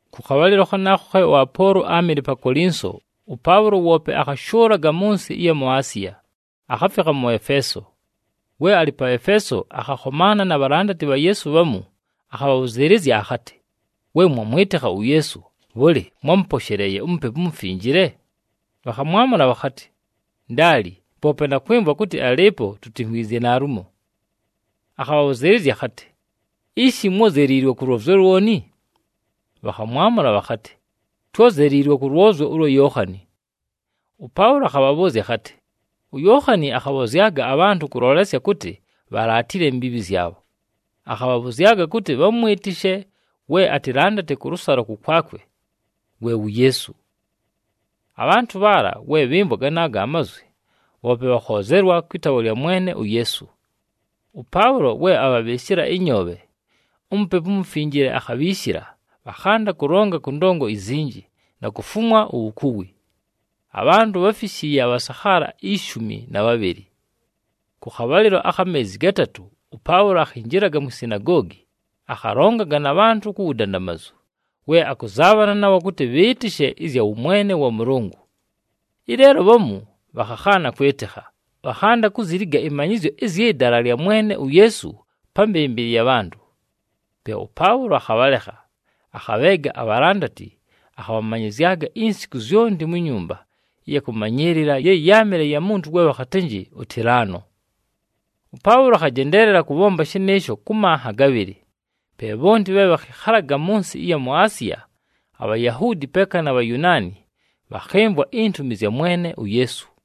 Kʉ khabhalɨlo khanaakho khe ʉApoolo áamɨle pa Kolinso, ʉPaʉlo woope akhashʉʉlaga mʉ nsɨ ɨya mu Asiya, akhafikha mʉ Efeeso. We alɨ pa Efeeso, akhakhomaana na bhalandati bha Yeesu bhamu, akhabhabhʉzɨɨlɨzya akhatɨ, “We mwamwɨtɨkha uYeesu, bhʉlɨ, mwámʉposheleeye uMupepu uMufinjile?” Bhakhamwamʉla bhakhatɨ, “Ndaali, poope na kwɨmvwa kʉtɨ alɨɨpo, tutimvwizye naalumo.” Akhabhabhʉzɨɨlɨzya akhatɨ, “Ishi, mwózeliilwe kʉ lwozyo lwoni?” Bhakhamwamʉla bhakhatɨ, “Twózeliilwe kʉ lwozyo ʉlwa Yookhani.” ɄPaʉlo akhabhabhʉʉzya akhatɨ, “UYookhani akhabhozyaga abhantʉ kʉlolesya kʉtɨ bhalaatile imbiibhi zyabho. Akhabhabhʉzyaga kʉtɨ bhamwɨtɨshe we atɨlandate kʉlʉsalo kʉkwakwe, we wu Yeesu.” Abhantʉ bhaala, we bhɨmvwa ganaago amazwi, bhoope bhakhoozelwa kwɨ taawa lya Mwene uYeesu. ɄPaʉlo we abhabhɨɨshɨla ɨnyoobhe, uMupepu uMufinjile akhabhiishila, bhakhanda kʉlonga kʉ ndongo izinji, na kufumwa uwukuwi. Abhantʉ bháfishiiye abhasakhaala ishumi na bhabhɨlɨ. Kʉ khabhalɨlo akha meezi gatatʉ, ʉPaʉlo akhinjilaga mwi sinagoogi, akhalongaga na bhantʉ ku wudandamazu we akʉzaabhana nabho kʉtɨ bhɨɨtɨshe ɨzya wʉmwene wa Mʉlʉngʉ. Ɨleelo bhamu bhakhakhaana kwɨtɨkha, bhakhanda kuziliga ɨmanyɨzyo ɨzyɨ Dala lya Mwene uYeesu pa mbɨmbɨlɨ ya bhantʉ. Pe ʉPaʉlo akhabhalekha, akhabheega abhalandati, akhamanyɨzyaga insiku zyonti mu nyumba ɨya kʉmanyɨɨlɨla ye yáamɨle ya muntu we bhakhatɨnjɨ uTilano. ɄPaʉlo akhajendeelela kʉbhomba shɨnɨɨsho kʉ manha gabhɨlɨ, pe bhonti bhe bhakhɨkhalaga mʉ nsɨ ɨya mu Asiya, aBhayahuudi peeka na Bhayunaani bhakhɨmvwa intumi zya Mwene uYeesu.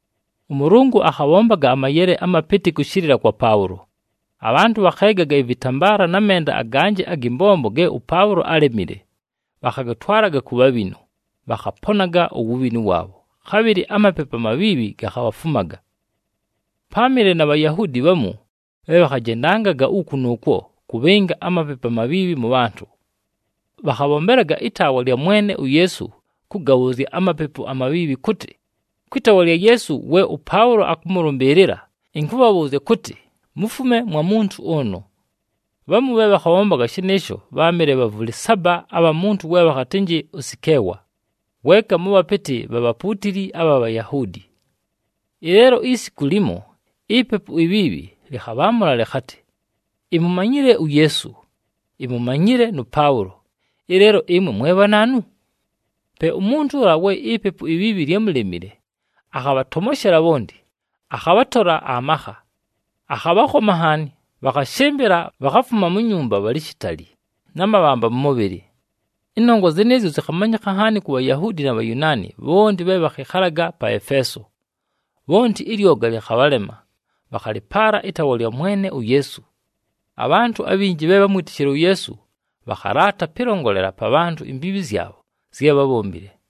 ɄMʉlʉngʉ akhabhombaga amayele amapɨtɨ kʉshɨlɨla kwa Paʉlo. Abhantʉ bhakheegaga ɨvɨtambaala na menda aganjɨ agɨ mbombo ge ʉPaʉlo álemile, bhakhagatwalaga ku bhabhinu, bhakhaponaga uwubhinu waabho, khabhɨlɨ amapepu amabhiibhi gakhabhafumaga. Páamɨle na Bhayahuudi bhamu bhe bhakhajendangaga uku nʉʉkwo, kʉbhɨnga amapepu amabhiibhi mʉ bhantʉ. Bhakhabhombelaga ɨtaawa lya Mwene uYeesu kʉgabhʉʉzya amapepu amabhiibhi kʉtɨ, “Kwɨ taawa lya Yeesu we ʉPaʉlo akʉmʉlʉmbɨɨlɨla, ɨnkʉbhabhʉʉzya kʉtɨ, mufume mwa muntu ʉnʉ.” Bhamu bhe bhakhabhombaga shɨnɨɨsho bháamɨle bhavʉlɨ saba abha muntu we bhakhatɨnjɨ uSikeewa, weeka mʉ bhapɨtɨ bha bhapuutili abha Bhayahuudi. Ɨleelo isiku limo, ipepu ibhiibhi lɨkhabhaamʉla lɨkhatɨ, “Imumanyile uYeesu, imumanyile nʉ Paʉlo, ɨleelo ɨmwe mwe bhanaanu?” Pe umuntu ʉla we ipepu ibhiibhi lyámulemile akhabhatomoshela bhonti, akhabhatola amakha. Akhabhakhoma nhaani, bhakhashɨmbɨla, bhakhafuma mu nyumba bhalɨ shitali, na mabhamba mʉ mʉbhɨlɨ. Ɨnongwa zɨnɨɨzyo zɨkhamanyɨkha nhaani ku Bhayahuudi na Bhayunaani bhonti bhe bhakhɨkhalaga pa Efeeso. Bhonti ɨlyoga lɨkhabhalema, bhakhalɨpaala ɨtaawa lya Mwene uYeesu. Abhantʉ abhinji bhe bhámwitishile uYeesu bhakhalaata pɨlongolela pa bhantʉ imbiibhi zyabho zye bhábhombile.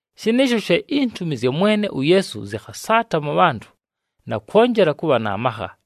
Shɨnɨɨsho she intumi zya Mwene uYeesu zɨkhasaata mʉ bhantʉ, na kwonjela kʉbha na makha.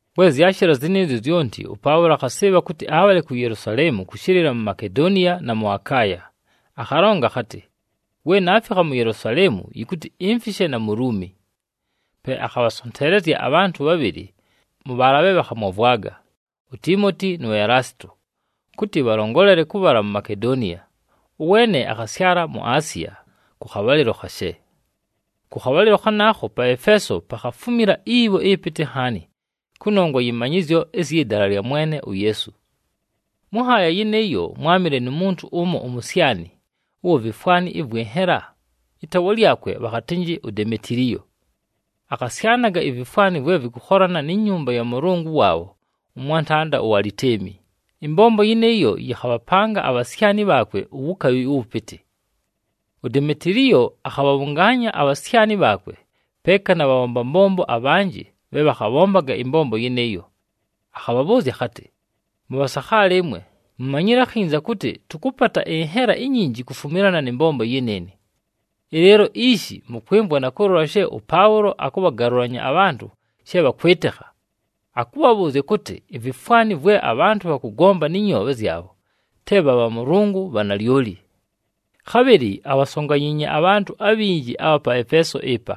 We zyashɨla zɨnɨɨzyo zyonti, ʉPaʉlo akhasɨɨbha kʉtɨ abhale ku Yelusaleemu kʉshɨlɨla mu Makedoniya, na mʉ Akaaya. Akhalonga akhatɨ, “We naafikha mu Yelusaleemu, yɨkʉtɨ imfishe na mu Luumi.” Pe akhabhasonteelezya abhantʉ bhabhɨlɨ mʉ bhaala bhe bhakhamwavwaga, uTiimoti nu Elaasito, kʉtɨ bhalongolele kʉbhala ku Makedoniya, ʉweene akhasyala mu Asiya kʉ khabhalɨlo khashe. Kʉ khabhalɨlo khanaakho pa Efeeso, pakhafumila ibho ɨpɨtɨ nhaani kʉnongwa yɨ manyɨzyo ɨzyɨ Dala lya Mwene uYeesu. Mʉ nhaaya yɨnɨɨyo mwámɨle nu muntu ʉmo umusyani ʉwa vifwani ɨvwɨ nhela, ɨtaawa lyakwe bhakhatɨnjɨ uDemetiliyo. Akhasyanaga ivifwani vwe vɨkʉkholana ni nyumba ya mʉlʉngʉ waabho ʉmwantanda uAlitemi, ɨmbombo yɨnɨɨyo yɨkhabhapanga abhasyani bhaakwe uwukabhi ʉwʉpɨtɨ. UDemetiliyo akhabhabhʉngaanya abhasyani bhaakwe, peeka na bhabhomba mbombo abhanjɨ bhe bhakhabhombaga ɨmbombo yɨnɨɨyo. Akhabhabhʉʉzya akhatɨ, “Mʉbhasakhaala ɨmwe, mumanyile akhinza kʉtɨ tʉkʉpata ɨnhela inyinji kufumilana nɨ mbombo yɨnɨɨnɨ. Ɨleelo ishi mʉkwɨmvwa na kʉlola she ʉPaʉlo akʉbhagalʉlanya abhantʉ she bhakwɨtɨkha, akʉbhabhʉʉzya kʉtɨ ivifwani vwe abhantʉ bhakʉgomba nɨ nyoobhe zyabho te bha bhamʉlʉngʉ bha nalyoli. Khabhɨlɨ abhasonganyiinye abhantʉ abhinji abha pa Efeeso ɨpa,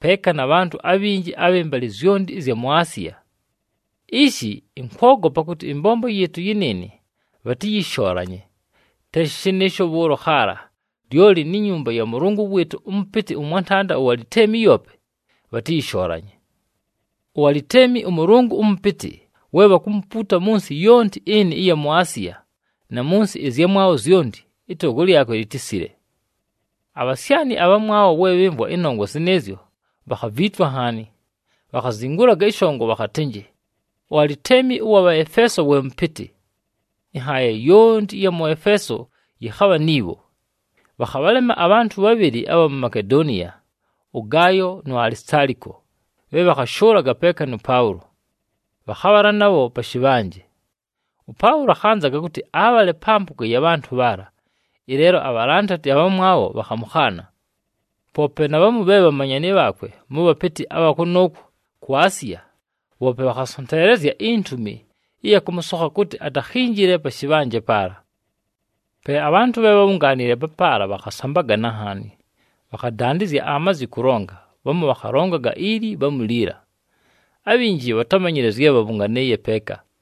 peeka na bhantʉ abhinji abhɨ mbalɨ zyonti ɨzya mu Asiya. Ishi, ɨnkwogopa kʉtɨ ɨmbombo yɨɨtʉ yɨnɨɨnɨ bhatɨyɨshoolanye, te shɨnɨɨsho bhʉʉlo khaala, lyoli ni nyumba ya mʉlʉngʉ wɨɨtʉ ʉmʉpɨtɨ ʉmwantanda uAlitemi yoope, bhatɨyɨshoolanye. UAlitemi ʉmʉlʉngʉ ʉmʉpɨtɨ, we bhakumupuuta mʉ nsɨ yonti ɨnɨ ɨya mu Asiya, na mʉ nsɨ ɨzyamwabho zyonti, ɨtogo lyakwe litisile.” Abhasyani abhamwabho we bhɨmvwa ɨnongwa zɨnɨɨzyo bhakhaviitwa nhaani. Bhakhazingulaga ɨshongo bhakhatɨnjɨ, “UAlitemi ʉwa Bhaefeeso we mʉpɨtɨ!” Ɨnhaaya yonti ɨya mʉ Efeeso yɨkhabha ni bho. Bhakhabhalema abhantʉ bhabhɨlɨ abha mu Makedoniya, ʉGaayo nu Alisitaaliko, bhe bhakhashʉʉlaga peeka nʉ Paʉlo. Bhakhabhala nabho pa shɨbhanje. ɄPaʉlo akhanzaga kʉtɨ abhale pa mpʉga ya bhantʉ bhaala, ɨleelo abhalandati abhamwabho bhakhamʉkhaana. Poope na bhamu bhe bhamanyani bhaakwe mʉ bhapɨtɨ abha kʉnʉʉkwo ku Asiya, bhoope bhakhasonteelezya intumi ɨya kʉmʉsokha kʉtɨ atakhinjile pa shɨbhanje paala. Pe abhantʉ bhe bhábhungaanile papaala bhakhasambagana nhaani. Bhakhadandɨzya amazi kʉlonga, bhamu bhakhalongaga ili, bhamu liila. Abhinji bhatámanyile zye bhabhʉnganɨɨye peeka.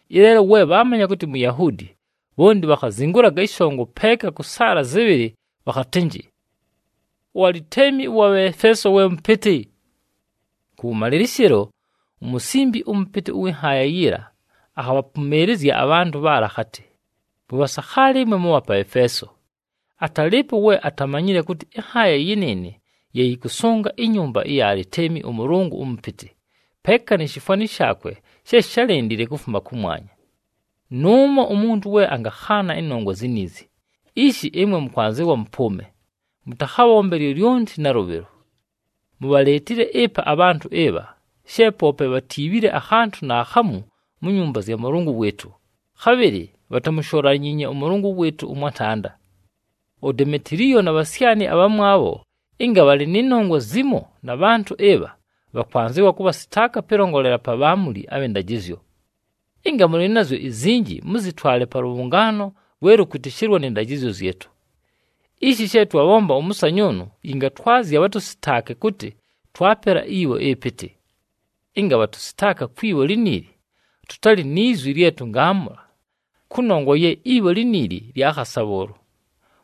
Ɨleelo we bhaamanya kʉtɨ Muyahuudi, bhonti bhakhazingulaga ɨshongo peeka kʉ saala zɨbhɨlɨ bhakhatɨnjɨ, “UAlitemi ʉwa Bhaefeeso we mʉpɨtɨ!” Kʉwʉmalɨlɨshɨlo, umusimbi ʉmʉpɨtɨ ʉwɨ nhaaya yiila akhabhapʉmɨɨlɨzya abhantʉ bhaala akhatɨ, “Mʉbhasakhaala ɨmwe mʉbha pa Efeeso, atalɨɨpo we atamanyile kʉtɨ ɨnhaaya yɨnɨɨnɨ ye yɨkʉsʉnga inyumba ya Alitemi ʉmʉlʉngʉ ʉmʉpɨtɨ, peeka ni shifwani shaakwe she shálendile kufuma kʉmwanya. Nʉʉmo umuntu we angakhaana ɨnongwa ziniizi, ishi ɨmwe mʉkwanzɨwa mʉpʉʉme, mʉtakhabhombe lyolyonti nalʉbhɨlo. Mubhaleetile ɨpa abhantʉ ɨbha, she poope bhatiibhile akhantʉ naakhamu mu nyumba zya mʉlʉngʉ wɨɨtʉ, khabhɨlɨ bhatamusholanyiinye ʉmʉlʉngʉ wɨɨtʉ ʉmwantanda. UDemetiliyo na bhasyani abhamwabho ɨnga bhalɨ nɨ nongwa zimo na bhantʉ ɨbha bhakwanzɨwa kʉbhasɨtaaka pɨlongolela pa bhaamuli abhɨ ndajɨzyo. Ɨnga mʉlɨ nazyo izinji, mʉzɨtwale pa lʉbhʉngaano lwe lʉkwɨtɨshɨlwa nɨ ndajɨzyo zyɨtʉ. Ishi she twabhomba ʉmʉsanyʉʉnʉ yɨngatwazya bhatʉsɨtaake kʉtɨ twapela ibho ɨpɨtɨ. Ɨnga bhatʉsɨtaaka kwi bho liniili, tʉtalɨ ni zwi lye tʉngaamʉla, kʉnongwa ye ibho liniili lya khasa bhʉʉlo.”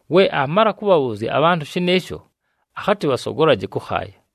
We aamala kʉbhabhʉʉzya abhantʉ shɨnɨɨsho, akhatɨ bhasogolaje kʉkhaaya.